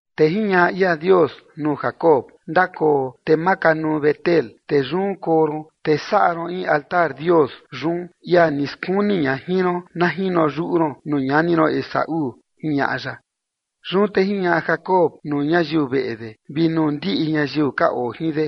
Te jiñaꞌa ia Dios nuu Jacob: ―Ndakoo te makanuu Betel, te yun koo ron, te saꞌa ron in altar Dios yun, ia ni skuni ña jin ron na jino yuꞌu ron nuu ñani ron Esaú ―jiñaꞌa ya. Yun te jiñaꞌa Jacob nuu ñayiu veꞌe de vi nuu ndiꞌi ñayiu ka oo jin de: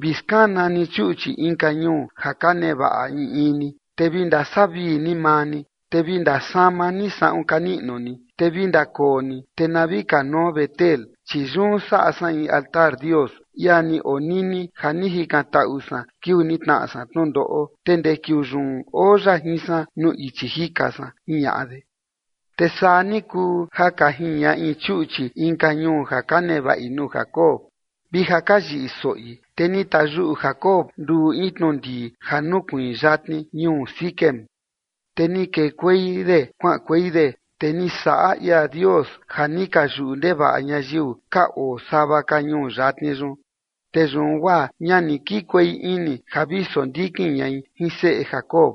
―Vi skana ni chuꞌchi inka ñuu ja ka nevaꞌa in in ni, te vi ndasavii ni maa ni, te vi ndasama ni saꞌun ka niꞌnu ni. Te vi ndakoo ni, te na vi kanuo Betel, chi yun saꞌa san in altar Dios, ia ni onini ja ni jikantaꞌu san kiuu ni tnaꞌa san tnundoꞌo, te ndee kiuu yun oo ya jin san nuu ichi jika san ―jiñaꞌa de. Te saa ni kuu ja ka jiñaꞌi chuꞌchi inka ñuu ja ka nevaꞌi nuu Jacob, vi ja ka yiꞌi soꞌi, te ni tayuꞌu Jacob nduꞌu in tnundii ja nukuiin yatni ñuu Siquem. Te ni kekuei de kuaꞌankuei de, te ni saꞌa ia Dios ja ni ka yuꞌu ndevaꞌa ñayiu ka oo sava ka ñuu yatni yun, te yun guaa ña ni kikuei ini ja vi sondikin ñai jin seꞌe Jacob.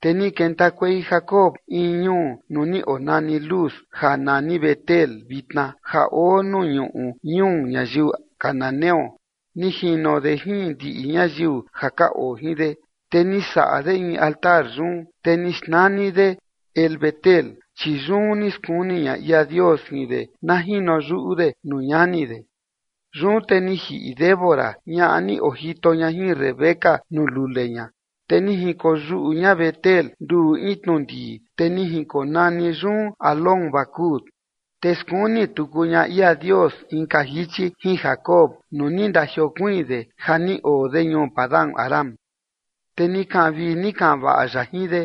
Te ni kentakuei Jacob in ñuu nuu ni onani Luz ja nani Betel vitna ja oo nuu ñuꞌu ñuu ñayiu cananeo, ni jino de jin ndiꞌi ñayiu ja ka oo jin de. Te ni saꞌa de in altar yun, te ni xnani de El-betel, chi yun ni skuni ña ia Dios jin de na jino yuꞌu de nuu ñani de. Yun te ni jiꞌi Débora, ñaꞌa ni ojito ña jin Rebeca nuu lule ña, te ni jinkoyuꞌu ña Betel nduꞌu in tnundii, te ni jinkonani yun Alón-bacut. Te skuni tuku ña ia Dios inka jichi jin Jacob nuu ni ndajiokuiin de ja ni oo de ñuu Padan-aram, te ni kaꞌan vii ni kaꞌan vaꞌa ya jin de.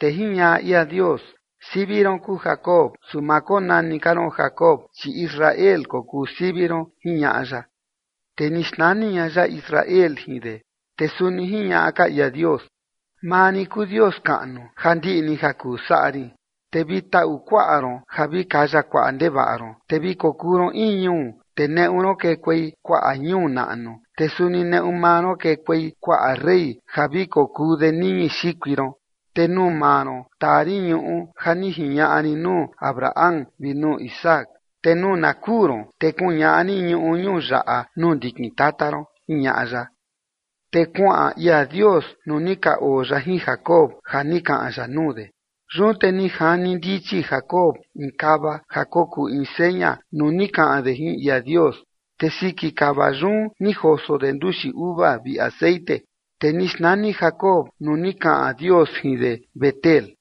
Te jiñaꞌa ia Dios: ―Sivi ron kuu Jacob, su ma konani ka ron Jacob, chi Israel kokuu sivi ron ―jiñaꞌa ya. Te ni xnani ña ya Israel jin de. Te suni jiñaꞌa ka ia Dios: ―Maa rin kuu Dios kaꞌnu ja ndiꞌi ni ja kuu saꞌa rin, te vi taꞌu kuaꞌa ron ja vi kaya kuaꞌa ndevaꞌa ron, te vi kokuu ron in ñuu, te neꞌu ron kekuei kuaꞌa ñuu naꞌnu, te suni neꞌu maa ron kekuei kuaꞌa rey ja vi kokuu de niñi xikui ron. Te nuu maa ron taa rin ñuꞌu ja ni jiñaꞌa rin nuu Abraham vi nuu Isaac, te nuu na kuu ron te kuñaꞌa rin ñuꞌu ñuu yaꞌa nuu ndikin tata ron ―jiñaꞌa ya. Te kuaꞌan ia Dios nuu ni ka oo ya jin Jacob ja ni kaꞌan ya nuu de. Yun te ni jani ndichi Jacob in kava ja kokuu in seña nuu ni kaꞌan de jin ia Dios, te siki kava yun ni joso de nduxi uva vi texeꞌen. Te ni xnani Jacob nuu ni kaꞌan Dios jin de Betel.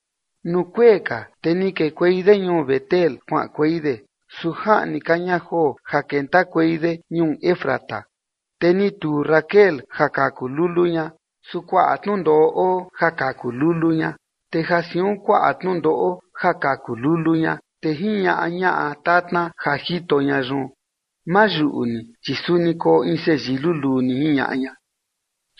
Nuu kuee ka, te ni kekuei de ñuu Betel kuaꞌankuei de, su jaꞌni ka ña joo ja kentakuei de ñuu Efrata, te ni tuu Raquel ja kaku lulu ña, su kuaꞌa tnundoꞌo oo ja kaku lulu ña. Te ja siun kuaꞌa tnundoꞌo ja kaku lulu ña, te jiñaꞌa ñaꞌa tatna ja jito ña yun: ―Ma yuꞌu ni, chi suni koo in seyii luluu ni ―jiñaꞌa ña.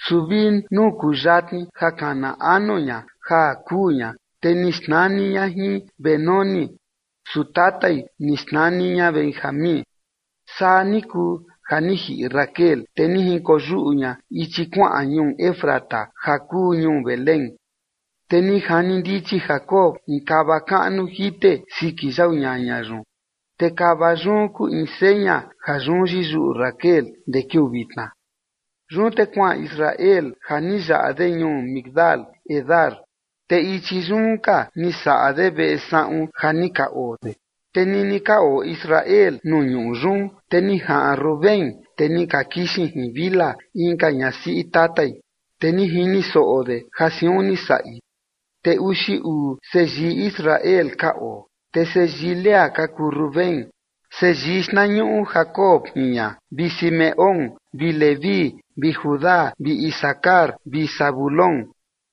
Su vi nuu kuyatni ja kana anu ña ja kuu ña, te ni xnani ña jin Benoni, su tatai ni xnani ña Benjamín. Saa ni kuu ja ni jiꞌi Raquel, te ni jinkoyuꞌu ña ichi kuaꞌan ñuu Efrata ja kuu ñuu Belén. Te ni jani ndichi Jacob in kava kaꞌnu jite siki yau ñaña yun, te kava yun kuu in seña ja yun yiyuꞌu Raquel ndee kiuu vitna. Yun te kuaꞌan Israel ja ni yaꞌa de ñuu Migdal-edar, te ichi yun ka ni saꞌa de veꞌe saꞌun ja ni ka oo de. Te nini ka oo Israel nuu ñuꞌu yun, te ni jaꞌan Rubén, te ni ka kixin jin Bilha inka ñasiꞌi tatai, te ni jini soꞌo de ja siun ni saꞌi. Te uxi uu seyii Israel ka oo. Te seyii Lea ka kuu Rubén, seyii xtnañuꞌu Jacob jin ña, vi Simeón vi Leví vi Judá vi Isacar vi Zabulón.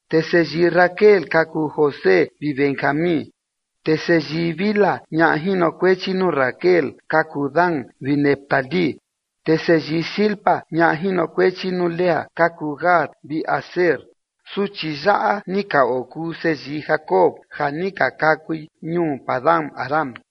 Te seyii Raquel ka kuu José vi Benjamín. Te seyii Bilha, ñaꞌa jinokuechi nuu Raquel, ka kuu Dan vi Neftalí. Te seyii Zilpa, ñaꞌa jinokuechi nuu Lea, ka kuu Gad vi Aser. Suchi yaꞌa ni ka okuu seyii Jacob ja ni ka kakui ñuu Padan-aram.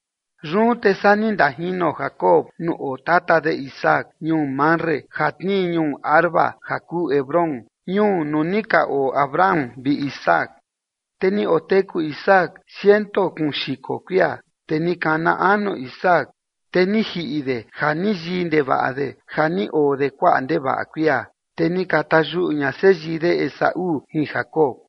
Yun te saa ni ndajino Jacob nuu oo tata de Isaac ñuu Mamre ja tnii ñuu Arba ja kuu Hebrón ñuu nuu ni ka oo Abraham vi Isaac. Te ni oteku Isaac ciento kuun xiko kuia. Te ni kana anu Isaac, te ni jiꞌi de ja ni yii ndevaꞌa de ja ni oo de kuaꞌa ndevaꞌa kuia, te ni ka tayuꞌu ña seyii de Esaú jin Jacob.